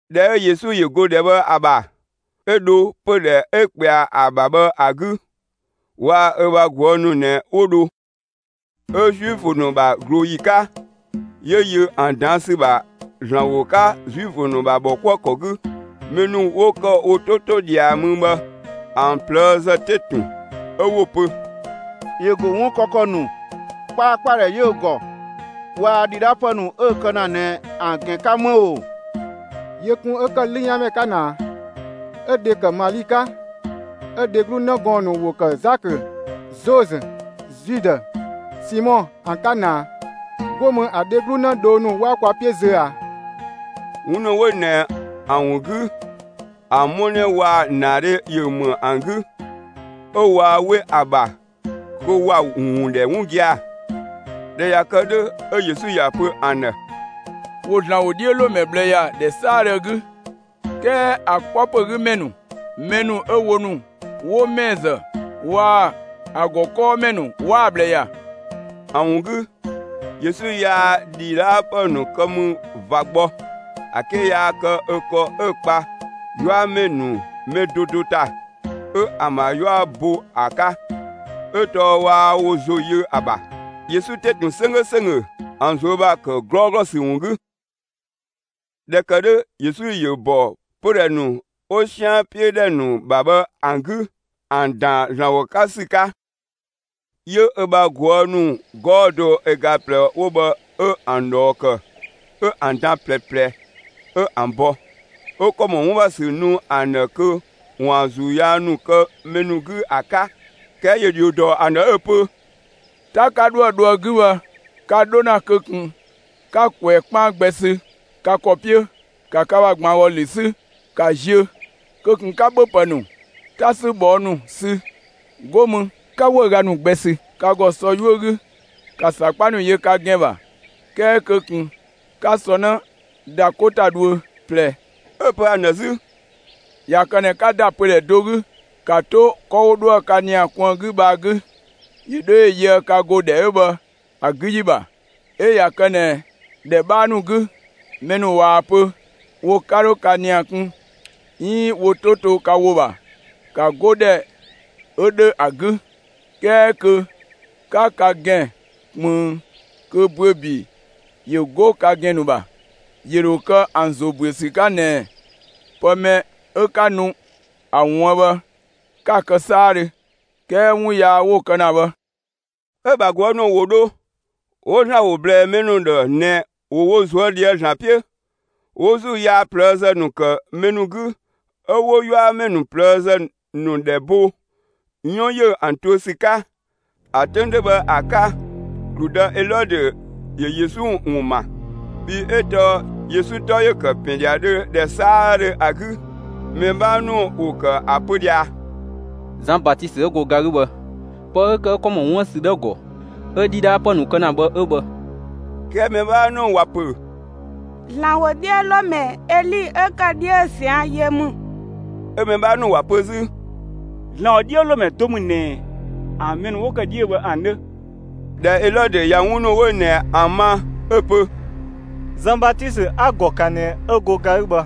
꞊Dhɛ 'ö Yesu ‑yö go ‑dhɛ bhë ‑a ‑bha, 'ö dho pödhɛ 'ö ꞊kpɛa ‑a ‑bha bhë ‑a 'gü. Waa‑ ö ‑bha ꞊guë' ‑nu ꞊nɛ 'wo dho. 'Ö Zuifö ‑nu ‑bha ꞊glooyi 'ka, 'yö yö ‑an ꞊daan' ‑sü ‑bha ‑Zlan ‑wo 'ka Zuifö ‑nu ‑bha ‑bhɔkuëkɔ 'gü. Mɛ ‑nu 'wo ‑kë wo 'to 'to ꞊dhia mü bhë, ‑an ꞊plëëzë 'te ‑tun, 'ö 'wo‑ pö: «‑Yö ‑go 'wun kë ‑kɔ ‑nu, 'kpaakpadhɛ 'yö‑ ‑gɔ, waa‑ ‑dhidhaapë ‑nu 'ö‑ kë ‑na ꞊nɛ ‑an ‑gɛn 'ka 'më ‑o! Yö ꞊kun 'ö 'lüyanmɛ 'ka ꞊naa, 'ö‑ dhe tɔɔ Mali, 'ö‑ dheglu 'në gɔɔn‑ ‑nu ‑wo ‑kë Zakö, Zozö, Zudë, Simɔ ‑an 'ka ꞊naa. 'Go mü ‑a dheglu 'në dhoo ‑nu 'waa kwa 'piö zö ꞊a?» 'Wun ‑nu 'wo ꞊nɛ ‑an ‑wun 'gü, ‑a 'mɔnɛ waa‑ ‑naadhe ‑yö ‑më ‑an 'gü, 'ö waa 'we ‑a ‑bha kö ‑wa ‑wun ‑dhɛ 'wun gia‑. ꞊Dhɛ ꞊ya kë 'dhö, 'ö Yesu ‑ya pö ‑an ‑dhë: «‑Wo ‑Zlan ‑wodhiölomɛ ꞊bhlë ‑ya ‑dhɛ 'saadhö 'gü, 'kɛɛ ‑a 'kpɔ ‑pö 'gü ‑mɛ ‑nu, mɛ ‑nu 'ö wo ‑nu 'wo ‑mɛɛ ‑zë waa‑ ‑a ‑gɔ 'kɔɔmɛ ‑nu 'waa‑ ꞊bhlë ‑ya.» ‑A ‑wun 'gü Yesu yaa ‑dhidhaapë ‑nu kë mü ꞊va gbɔ, ‑a 'ke yaa kë ö ‑kɔ 'ö‑ 'kpa 'yuamɛ ‑nu mɛ do do ‑ta, 'ö ‑an ‑bha 'yua bo ‑a 'ka. 'Ö tɔɔ 'waa wo ‑zo yö ‑a ‑bha. Yesu 'te ‑tun 'sönggö ‑sönggö ‑an ꞊zuö' ‑bha ‑kë 'glɔɔglɔ ‑sü ‑wun 'gü. ꞊Dhɛ ‑kë 'dhö Yesu ‑yö ‑bɔ pödhɛ ‑nu 'wo 'sian 'piö ‑dhɛ ‑nu ‑bha bhë ‑an 'gü ‑an ‑daan ‑Zlan ‑wo 'ka ‑sü 'ka. 'Yö ö bha ꞊guë' ‑nu 'gɔɔ‑ do ö ga ꞊plɛ 'wo bhë 'ö ‑an ꞊dhɔɔ ‑kë, 'ö ‑an dan ꞊plɛ ꞊plɛ, 'ö ‑an bɔ, 'ö ‑kɔ ‑mɔ 'wun ‑bha ‑sü nu ‑an ‑dhë kö ‑waan ‑zuu yaa ‑nu kë mɛ ‑nu 'gü ‑a 'ka. 'Kɛɛ ‑yö ‑dhio dɔ ‑an ‑dhë 'ö‑ pö: «'Ta 'ka 'dhoë‑ dho ‑a 'gü bhë, ka 'dho ‑na kö ꞊kun 'ka ꞊kwɛɛ‑ 'kpaan gbɛ sü ka ‑kɔ 'piö; ka ka ‑bha ‑gbangɔlü 'sü, ‑ka ziö! Kö ꞊kun 'ka ‑bhöpë ‑nu, 'ta 'sü ꞊bhɔɔ' ‑nu sü! 'Go mü 'ka 'wëüga ‑nu gbɛ ‑da ka ‑gɔ sɔ 'yuö‑ 'gü! ‑Ka ‑sakpa ‑nu yö ka ‑gɛn ‑bha, 'kɛɛ kö ꞊kun 'ka sɔ 'në ‑da 'ko ‑ta dhuö ꞊plɛ!» 'Ö‑ pö ‑an ‑dhë 'zü: «꞊Ya kë ꞊nɛ 'ka ‑da pödhɛ do 'gü, ‑ka 'to 'kɔ 'wo 'dhoë‑ ka ‑nia kun ‑a 'gü bhë ‑a 'gü, ‑yö 'dho ‑yö yöë ka ‑go ‑dhɛ 'ö bhë ‑a 'gü ‑yi ‑bha! 'Ö ꞊ya kë ꞊nɛ ‑dhɛ 'bhaa ‑nu 'gü, mɛ ‑nu ꞊waa‑ pö wo 'ka 'dho ka ‑nia kun 'iin wo 'to to ka ‑wo ‑bha, ‑ka 'go ‑dhɛ 'ö 'dhö ‑a 'gü; 'kɛɛ kö 'ka ka ‑gɛn ꞊kpënng kö ‑büö ‑bi ‑yö 'go ka ‑gɛn ‑nu ‑bha. ‑Yö ‑dho kë ‑an ‑zo ‑büö ‑sü 'ka ꞊nɛɛ pë mɛ 'ö 'ka nu ‑a ‑wuën bhë, 'ka‑ kë 'saadhö, 'kɛɛ 'wun yaa 'wo‑ kë ‑na bhë.» 'Ö‑ ‑bha ꞊guë' ‑nu ‑wo dho, 'wo ‑Zlan ‑wo ꞊blɛɛ mɛ ‑nu ‑dhë ꞊nɛ ‑wo wo ꞊zuö' ꞊dhië'‑ ‑Zlan 'piö. 'Wo ‑zuu yaa ꞊plëëzë ‑nu ‑kë mɛ ‑nu 'gü, 'ö 'wo 'yuamɛ ‑nu ꞊plëëzë ‑nu ‑dhɛ bo 'yɔn ‑yö ‑an tuö ‑sü 'ka. ‑A 'töng 'dhö bhë ‑a 'ka, ‑gludë Elɔdö ‑yö Yesu ‑wun ‑ma, bhii 'ö tɔɔ Yesu 'tɔ ‑yö ‑kë ‑pɛn ‑dhiadhö ‑dhɛ 'saadhö ‑a 'gü. Mɛ 'bhaa ‑nu ‑wo ‑kë ‑a pö ꞊dhia: «Zan Batisö 'ö go ga 'gü bhë, pë 'ö ‑kë 'ö ‑kɔ ‑mɔ 'wun ‑bha ‑sü 'dhö ‑a ‑gɔ 'ö ‑dhidhaapë ‑nu kë ‑na bhë 'ö bhë.» 'Kɛɛ mɛ 'bhaa ‑nu ‑wa ‑pö: «‑Zlan ‑wodhiölomɛ Eli 'ö ‑kë 'dhiö zian yö ‑mü.» 'Ö‑ mɛ 'bhaa ‑nu ‑wa pö 'zü: «‑Zlan ‑wodhiölomɛ do ‑mü ꞊nɛ ‑an mɛ ‑nu 'wo ‑kë 'dhiö bhë ‑an 'dhö.» ꞊Dhɛ Elɔdö ꞊ya 'wun ‑nu 'wo ꞊nɛ ‑an ma 'ö‑ pö: «Zan Batisö 'a‑ ‑gɔ ‑kan ꞊nɛ 'ö go ga 'gü bhë!»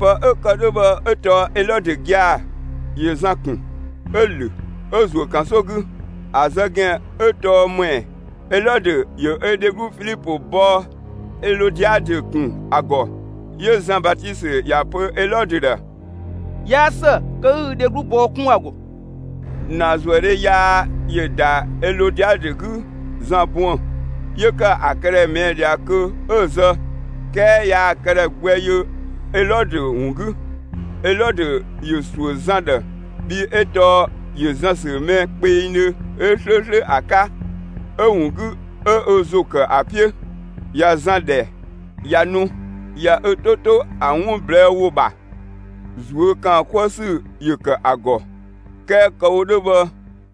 Pë 'ö ‑kë 'dhö bhë 'ö tɔɔ Elɔdö gia‑ ‑yö Zan ‑kun, 'ö‑ ‑lö, 'ö‑ ‑zuö ‑kansokɔ 'gü. (‑A zë ‑gɛn 'ö tɔɔ ‑më ‑ɛ?) Elɔdö ‑yö ö dheglu Filipö bɔɔ Elɔdiadö 'kun ‑a ‑gɔ. 'Yö Zan Batisö ‑ya ‑pö Elɔdö ‑dhë: «'Yaa ‑së kö 'ü ü dheglu bɔɔ 'kun ‑a ‑gɔ!» ‑Naazuëdhe yaa ‑yö ‑da Elɔdiadö 'gü Zan buën‑, 'yö ‑kë ‑a këdhɛ ꞊mɛɛ' ꞊dhia kö 'ö‑ zë, 'kɛɛ yaa‑ këdhɛ gbɛ yö Elɔdö ‑wun 'gü. Elɔdö ‑yö ‑suö Zan ‑dhë, bhii 'ö tɔɔ ‑yö Zan ‑sü mɛ kpengdhö, 'ö 'slööslö ‑a 'ka; 'ö‑ ‑wun 'gü 'ö ö ‑zo ‑kë ‑a 'piö. ꞊Ya Zan ‑dhɛ, ꞊ya nu, ꞊ya ö 'to 'to ‑a 'wun ꞊blɛɛ' ‑wo ‑bha, ꞊zuö' ‑kaan 'kuë ‑sü ‑yö ‑kë ‑a ‑gɔ. 'Kɛɛ kë‑ wo 'dhö bhë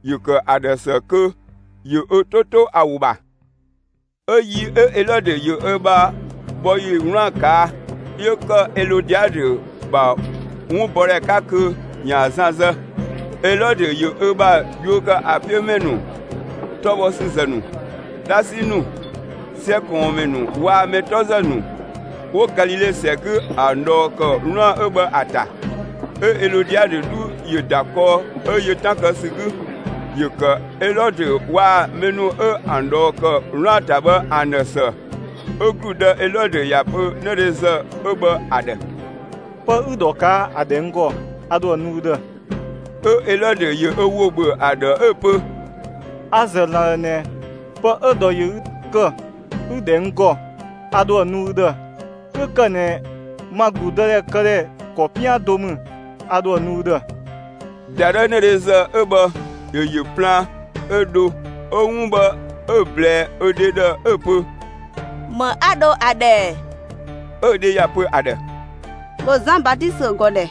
‑yö ‑kë ‑a ‑dhë ‑së kö ‑yö ö 'to 'to ‑a ‑wo ‑bha. 'Ö yi Elɔdö ‑yö ‑ö bha bhɔ ‑yi 'wlaan‑ ꞊kaa', 'yö ‑kë Elɔdiadö ‑bha 'wunbɔdhɛ 'ka kö ‑yaan Zan zë. Elɔdö ‑yö ö bha yuö ‑kë ‑a 'piö ‑mɛ ‑nu, 'tɔ bhɔ ‑sü ‑zë ‑nu, 'dhasi ‑nu, 'sɛ ꞊kɔɔnmɛ ‑nu waa‑ mɛ 'tɔ ‑zë ‑nu 'wo Galile ‑sɛ 'gü ‑an ꞊dhɔɔ ‑kë 'wlaan‑ 'ö bhë ‑a ‑ta. 'Ö Elɔdiadö 'dhu ‑yö ‑da kɔɔ 'ö yö 'tan kë ‑sü 'gü. ‑Yö ‑kë Elɔdö waa‑ mɛ ‑nu 'ö ‑an ꞊dhɔɔ ‑kë 'wlaan‑ ‑ta bhë ‑an ‑dhë ‑së. 'Ö ‑gludë Elɔdö ‑ya pö 'nëdhezë 'ö bhë ‑a ‑dhë: «Pë 'ü‑ ‑dhɔ ꞊kaa' ‑a ‑dhɛ n ‑gɔ, a ‑dho ‑a nu ü ‑dhë!» 'Ö Elɔdö ‑yö ö ‑wo ‑bhö ‑a ‑dhë 'ö‑ pö: «A‑ ‑zë ‑Zlan ‑dhë ꞊nɛ, pë 'ö‑ ‑dhɔ ‑yö ü ‑kë 'ü‑ ‑dhɛ n ‑gɔ, a ‑dho ‑a nu ü ‑dhë, 'kö ‑kë ꞊nɛ ma ‑gludëdhɛ këdhɛ ‑kɔ 'pian do ‑mü, a ‑dho ‑a nu ü ‑dhë.» ‑Dadhëü 'nëdhezë 'ö bhë ‑yö ‑yö plaan, 'ö dho 'ö 'wun bhë 'ö‑ ꞊blɛɛ ö dhe ‑dhë, 'ö‑ pö: «‑Më 'a dho ‑a ‑dhɛ ‑ɛ?» 'Ö‑ dhe ‑ya pö ‑a ‑dhë: «‑Bhö Zan Batisö ‑gɔ ‑dhɛ!»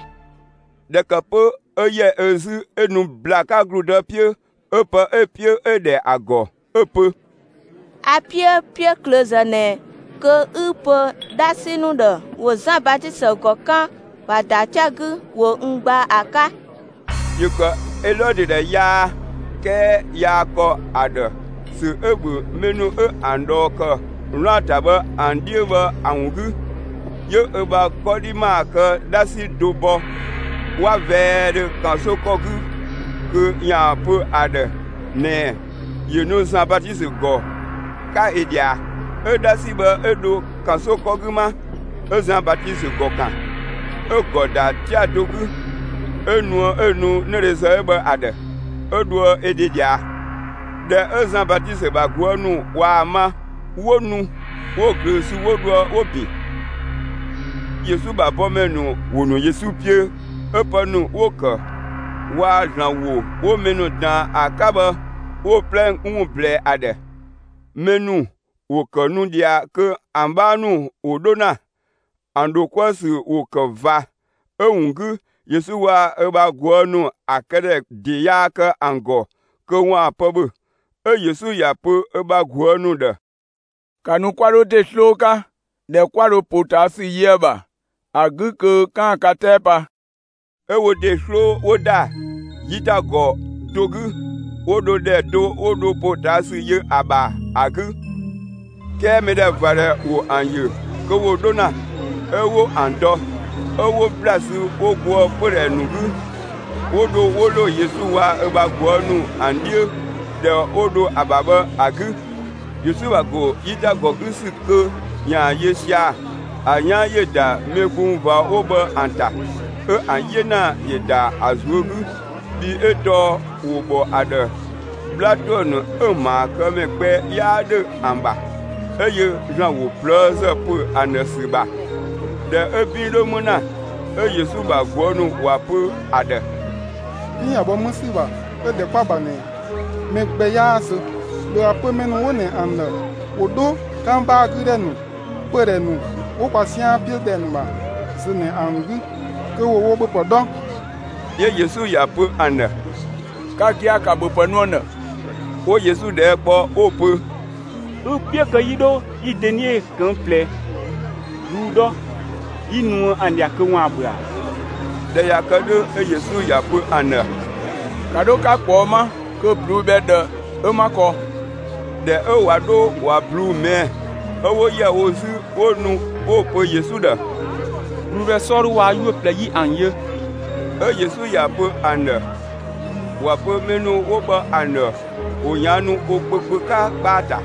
꞊Dhɛ ‑kë 'pö 'ö ‑yɛ ö 'zü 'ö nu ‑bla 'ka ‑gludë 'piö 'ö pë 'ö‑ 'piö 'ö‑ ‑dhɛ ‑a ‑gɔ 'ö‑ pö: «A‑ 'piö 'piöklöözë ꞊nɛ kö 'ü‑ pö 'dhasi ‑nu ‑dhë ‑wo Zan Batisö ‑gɔ 'kan, ‑wa ‑da 'tia‑ 'gü, 'wo n gbaa ‑a 'ka!» ‑Yö ‑kë Elɔdö ‑dhë yaa, 'kɛɛ yaa ‑kɔ ‑a ‑dhë, ‑sö 'ö‑ ‑bhö mɛ ‑nu 'ö ‑an ꞊dhɔɔ kë 'wlaan‑ ‑ta bhë ‑an 'dhiö bhë ‑a ‑wun 'gü. 'Yö ö bha 'kɔdhi ‑maa kë 'dhasi do bɔ 'wa vɛɛdhö ‑kansokɔ 'gü kö ꞊yaa‑ pö ‑a ‑dhë ꞊nɛɛ ‑yö nu Zan Batisö ‑gɔ 'ka ö ꞊dhia. 'Ö 'dhasi bhë 'ö dho ‑kansokɔ 'gü 'ma, 'ö Zan Batisö ‑gɔ ‑kan. 'Ö‑ ‑gɔ ‑da 'tia‑ do 'gü, 'ö nuë 'ö‑ nu 'nëdhezë bhë ‑a ‑dhë, 'ö dhoë ö dhe ꞊dhia. ꞊Dhɛ 'ö Zan Batisö ‑bha ꞊guë' ‑nu ꞊waa‑ ma, 'wo nu 'wo‑ ꞊glöö sü 'wo dhoë 'wo‑ ‑bin. Yesu ‑bha bɔmɛ ‑nu ‑wo ‑nu Yesu 'piö 'ö pë ‑nu 'wo‑ ‑kë waa‑ ‑Zlan ‑wo 'wo mɛ ‑nu ꞊daan ‑a 'ka bhë 'wo‑ 'plɛ ‑wun ꞊blɛɛ ‑a ‑dhë. Mɛ ‑nu ‑wo ‑kë nu ꞊dhia kö ‑an 'bhaa ‑nu ‑wo 'dho ‑na, ‑an ‑dho 'kuë‑ ‑sü ‑wo ‑kë ꞊va. 'Ö‑ ‑wun 'gü Yesu waa‑ ö bha ꞊guë' ‑nu ‑a këdhɛ ‑de yaa kë ‑an ‑gɔ kö ‑waan pë ‑bhö. 'Ö Yesu ‑ya pö ö bha ꞊guë' ‑nu ‑dhë: «‑Ka nu 'kwa 'dho ‑de 'sloo 'ka, ‑dhɛ 'kwa dho ‑potaasü yö ‑a ‑bha ‑a 'gü kö 'kaan‑ ka 'tɛɛ pa!» 'Ö wo ‑de 'sloo 'wo ‑da 'yitagɔ do 'gü, 'wo dho ‑dhɛ do 'wo dho ‑potaasü yö ‑a ‑bha ‑a 'gü. 'Kɛɛ mɛdhɛvadhɛ ‑wo ‑an ‑yö kö ‑wo 'dho ‑na 'ö 'wo ‑an dɔ. 'Ö 'wo ‑bla sü 'wo goë pödhɛ ‑nu 'gü, 'wo dho 'wo ‑lo Yesu waa‑ ö bha ꞊guë' ‑nu ‑an 'dhiö, ‑dhɛ 'wo dho ‑a ‑bha bhë ‑a 'gü. Yesu ‑bha ‑go 'yitagɔ 'gü ‑sü kö ‑yaan yö sia‑ ‑a 'yan ‑yö ‑da mɛ gbung ꞊va 'wo bhë ‑an ‑ta. 'Ö ‑an 'yena ‑yö ‑da ‑a ꞊zuö' 'gü, bhii 'ö tɔɔ ‑wo ‑bhɔ ‑a ‑dhë 'bhla ‑tuë ‑nu 'ö‑ ‑maakëmɛ gbɛ 'yaa ‑dhö ‑an ‑bha. 'Ö yö ‑Zlan ‑wo ꞊plëëzë ‑pö ‑an ‑dhë ‑sü ‑bha. ꞊Dhɛ 'ö 'bin 'dhö 'më ‑na, 'ö Yesu ‑bha ꞊guë' ‑nu ‑wa pö ‑a ‑dhë: «'Bin ꞊ya bhɔ 'më ‑sü ‑bha 'ö ‑dhɛ 'kwa‑ ‑bha ꞊nɛ, mɛ gbɛ 'yaa zö. ‑Bhö ‑a pö mɛ ‑nu 'wo ꞊nɛ ‑an ‑dhë ‑wo 'dho 'kangbaa 'gü ‑dhɛ ‑nu, pödhɛ ‑nu 'wo kwa 'sian 'piö ‑dhɛ ‑nu ‑bha zö ꞊nɛ ‑an 'gü kö ‑wo wo ‑bhöpë 'dhɔ!» 'Yö Yesu ‑ya pö ‑an ‑dhë: «Ka gia‑, ‑ka ‑bhöpë nu ‑an ‑dhë!» 'Wo Yesu ꞊dhɛɛ' kpɔ 'wo‑ pö: «Ü‑ 'piö kö 'yi 'dho 'yi dönie ꞊këng' ꞊plɛ ꞊bluu'‑ 'dhɔ 'yi nuë ‑an ꞊dhia kö ‑waan ‑bhö ‑a?» ꞊Dhɛ ꞊ya kë 'dhö, 'ö Yesu ‑ya pö ‑an ‑dhë: «‑Ka 'dho 'ka ꞊kpɔɔ' 'ma kö ꞊bluu'‑ bhɛ ꞊dhë 'ö 'ma kɔ.» ꞊Dhɛ 'ö ꞊wa 'dho ꞊wa ꞊bluu'‑ ꞊mɛɛ' 'ö 'wo ‑yɛ wo 'zü 'wo nu 'wo pö Yesu ‑dhë: «꞊Bluu'‑ bhɛ 'sɔɔdhu waa‑ 'yuö‑ ꞊plɛ 'yi ‑an yö.» 'Ö Yesu ‑ya pö ‑an ‑dhë ‑wa pö mɛ ‑nu 'wo bhë ‑an ‑dhë ‑wo ꞊yaannu wo kpö kpö 'ka 'kpaa‑ ‑ta.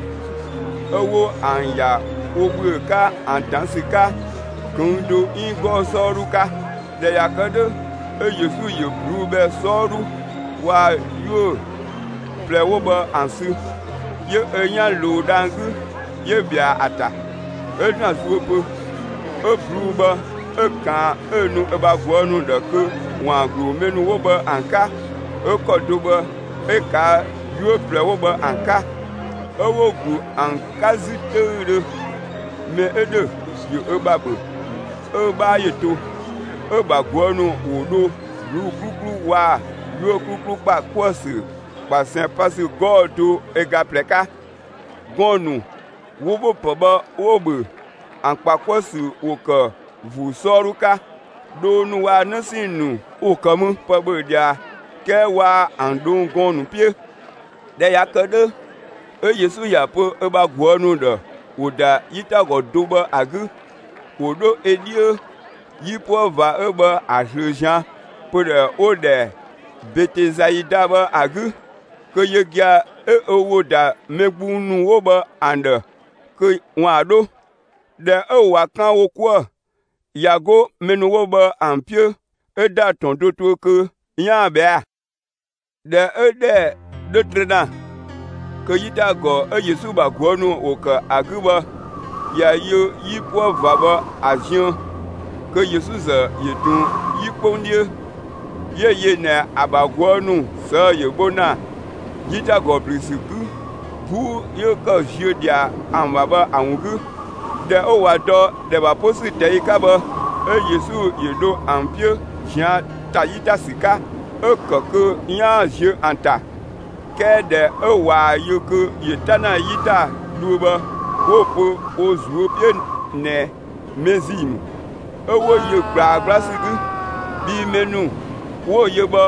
'Ö 'wo ‑an ‑ya wo ‑bhüö 'ka ‑an dan ‑sü 'ka ꞊këng' do 'iin 'gɔɔ‑ 'sɔɔdhu 'ka. ꞊Dhɛ ꞊ya kë 'dhö, 'ö Yesu ‑yö ꞊bluu'‑ bhɛ 'sɔɔdhu waa‑ 'yuö‑ ꞊plɛ 'wo bhë ‑an sü, 'yö ö 'yan ꞊luu dhang‑ 'gü, 'yö ꞊bhɛa ‑a ‑ta, 'ö ‑Zlan zuö pö. 'Ö ꞊bluu'‑ bhë 'ö‑ ꞊kaan 'ö‑ nu ö bha ꞊guë' ‑nu ‑dhë kö ‑waan ‑glu mɛ ‑nu 'wo bhë ‑an 'ka. 'Ö ‑kɔ do bhë 'ö‑ ꞊kaa' 'yuö‑ ꞊plɛ 'wo bhë ‑an 'ka, 'ö 'wo‑ ‑glu ‑an 'ka 'zü 'töüdhö. Mɛ 'ö ‑dhö ‑yö ö ‑bha ‑bhö, 'ö‑ 'bhaa ‑yö to. 'Ö‑ ‑bha ꞊guë' ‑nu ‑wo dho ꞊bluu'‑ 'kluklu waa‑ 'yuö‑ 'kluklu ‑kpa 'kuë‑ ‑sü ꞊kpasɛn pa ‑sü 'gɔɔ‑ do ö ga ꞊plɛ 'ka. Gɔɔn‑ ‑nu 'wo ‑bhöpë bhë 'wo‑ ‑bhö ‑an ‑kpa 'kuë‑ ‑sü ‑wo ‑kë ‑vuu 'sɔɔdhu 'ka, dhoo ‑nu waa‑ 'në 'sɛɛn‑ ‑nu ‑wo ‑kë mü pë ‑bhö ꞊dhia, 'kɛɛ waa ‑an ꞊dhong' gɔɔn‑ nu 'piö. ꞊Dhɛ ꞊ya kë 'dhö, 'ö Yesu ‑ya pö ö bha ꞊guë' ‑nu ‑dhë ‑wo ‑da 'yitagɔ do bhë ‑a 'gü, ‑wo 'dho ö 'dhiö 'yipuë ꞊va 'ö bhë ‑a ꞊zlöö ꞊zian' pödhɛ 'wo‑ ‑dhɛ Betesaida bhë ‑a 'gü, kö yö gia‑ 'ö ö ‑wo ‑da mɛ gbung ‑nu 'wo bhë ‑an ‑dhë kö ‑waan 'dho. ꞊Dhɛ 'ö ꞊wa 'kan wo 'kuë‑ ꞊ya 'go mɛ ‑nu 'wo bhë ‑an 'piö 'ö ‑da ‑tɔn do tuö kö 'yaan‑ ꞊bhɛa'‑. ꞊Dhɛ 'ö ‑dhɛ 'dhö trö ‑na, kö 'yitagɔ 'ö Yesu ‑bha ꞊guë' ‑nu ‑wo ‑kë ‑a 'gü bhë ꞊ya yö 'yipuë ꞊va bhë ‑a ziën, kö Yesu ‑zë ‑yö ꞊tun 'yi 'kpong 'dhiö. 'Yö‑ yö ꞊nɛ ‑a ‑bha ꞊guë' ‑nu ꞊sëë'‑ ‑yö bho ‑na 'yitagɔ ‑blü ‑sü 'gü 'buu 'yö ‑kë ‑ziö ꞊dhia ‑an ‑bha bhë ‑a ‑wun 'gü. ꞊Dhɛ 'ö ꞊wa dɔ ‑dhɛ ‑bha 'po ‑sü ꞊tɛi' 'ka bhë, 'ö Yesu ‑yö dho ‑an 'piö ꞊zian' ‑ta 'yi ‑ta ‑sü 'ka, 'ö‑ ‑kë kö 'yaan‑ ziö ‑an ‑ta. 'Kɛɛ ꞊dhɛ 'ö ꞊waa‑ yö kö ‑yö 'ta ‑na 'yi ‑ta dhuö bhë 'wo‑ pö wo ꞊zuö' 'piö ꞊nɛ mɛ ‑zii ‑mü. 'Ö 'wo yö ꞊gblaa 'gbla ‑sü 'gü. Bhii mɛ ‑nu 'wo‑ yö bhë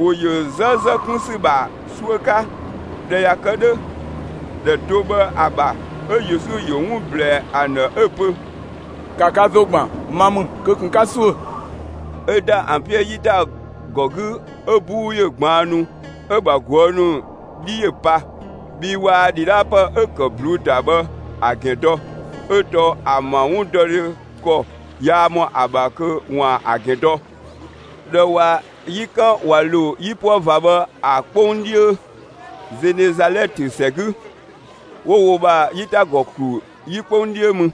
‑wo ‑yö zë ‑zë kun ‑sü ‑bha 'suö 'ka. ꞊Dhɛ ꞊ya kë 'dhö, ‑dhɛ do bhë ‑a ‑bha, 'ö Yesu ‑yö 'wun ꞊blɛɛ ‑an ‑dhë 'ö‑ pö: «‑Ka ka ‑zo ‑gban, ma ‑mü, kö ꞊kun 'ka ‑suö!» 'Ö ‑da ‑an 'piö 'yitagɔ 'gü 'ö 'buu ‑yö ꞊gbaannu. 'Ö‑ ‑bha ꞊guë' ‑nu 'dhi ‑yö pa, bhii waa ‑dhidhaapë 'ö‑ ‑kë ꞊bluu'‑ ‑ta bhë ‑a ‑gɛn dɔ, 'ö tɔɔ ‑an ‑bha 'wundɔdhe ‑kɔ yaa ‑mɔ ‑a ‑bha kö ‑waan ‑a ‑gɛn dɔ. ꞊Dhɛ ꞊wa 'yi 'kan ꞊wa ‑lo 'yipuë ꞊va bhë ‑a 'kpong 'dhiö Zenezalɛtö ‑sɛ 'gü, 'wo wo ‑bha 'yitagɔ ‑klu 'yi 'kpong 'dhiö mü.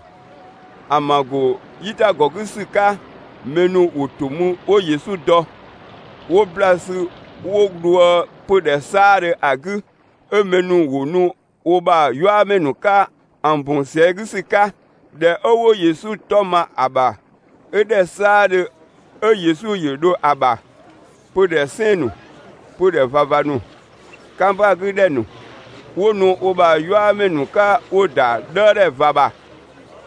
‑An ‑bha ‑go 'yitagɔ 'gü ‑sü 'ka, mɛ ‑nu ‑wo ‑to mü 'wo Yesu dɔ. 'Wo ‑bla sü 'wo dhoë pödhɛ 'saadhö ‑a 'gü. 'Ö mɛ ‑nu ‑wo ‑nu wo ‑bha 'yuamɛ ‑nu 'ka ‑an ‑bun ꞊sɛɛ' 'gü ‑sü 'ka ‑dhɛ 'ö 'wo Yesu 'tɔ ma ‑a ‑bha. 'Ö ‑dhɛ 'saadhö 'ö Yesu ‑yö dho ‑a ‑bha, pödhɛ 'sɛɛn‑ ‑nu, pödhɛ ꞊vava ‑nu, 'kangbaa 'gü ‑dhɛ ‑nu, 'wo nu wo ‑bha 'yuamɛ ‑nu 'ka 'wo‑ ‑da 'dhëëdhɛ ꞊va ‑bha.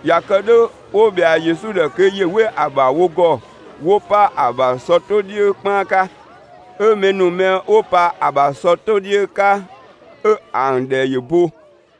꞊Ya kë 'dhö 'wo ꞊bhɛa Yesu ‑dhë kö ‑yö 'we ‑a ‑bha wo ‑gɔ 'wo 'pa ‑a ‑bha sɔ 'to 'dhiö 'kpaan 'ka. 'Ö mɛ ‑nu mɛ 'wo pa ‑a ‑bha sɔ 'to 'dhiö 'ka 'ö ‑an ‑dhɛ ‑yö bo.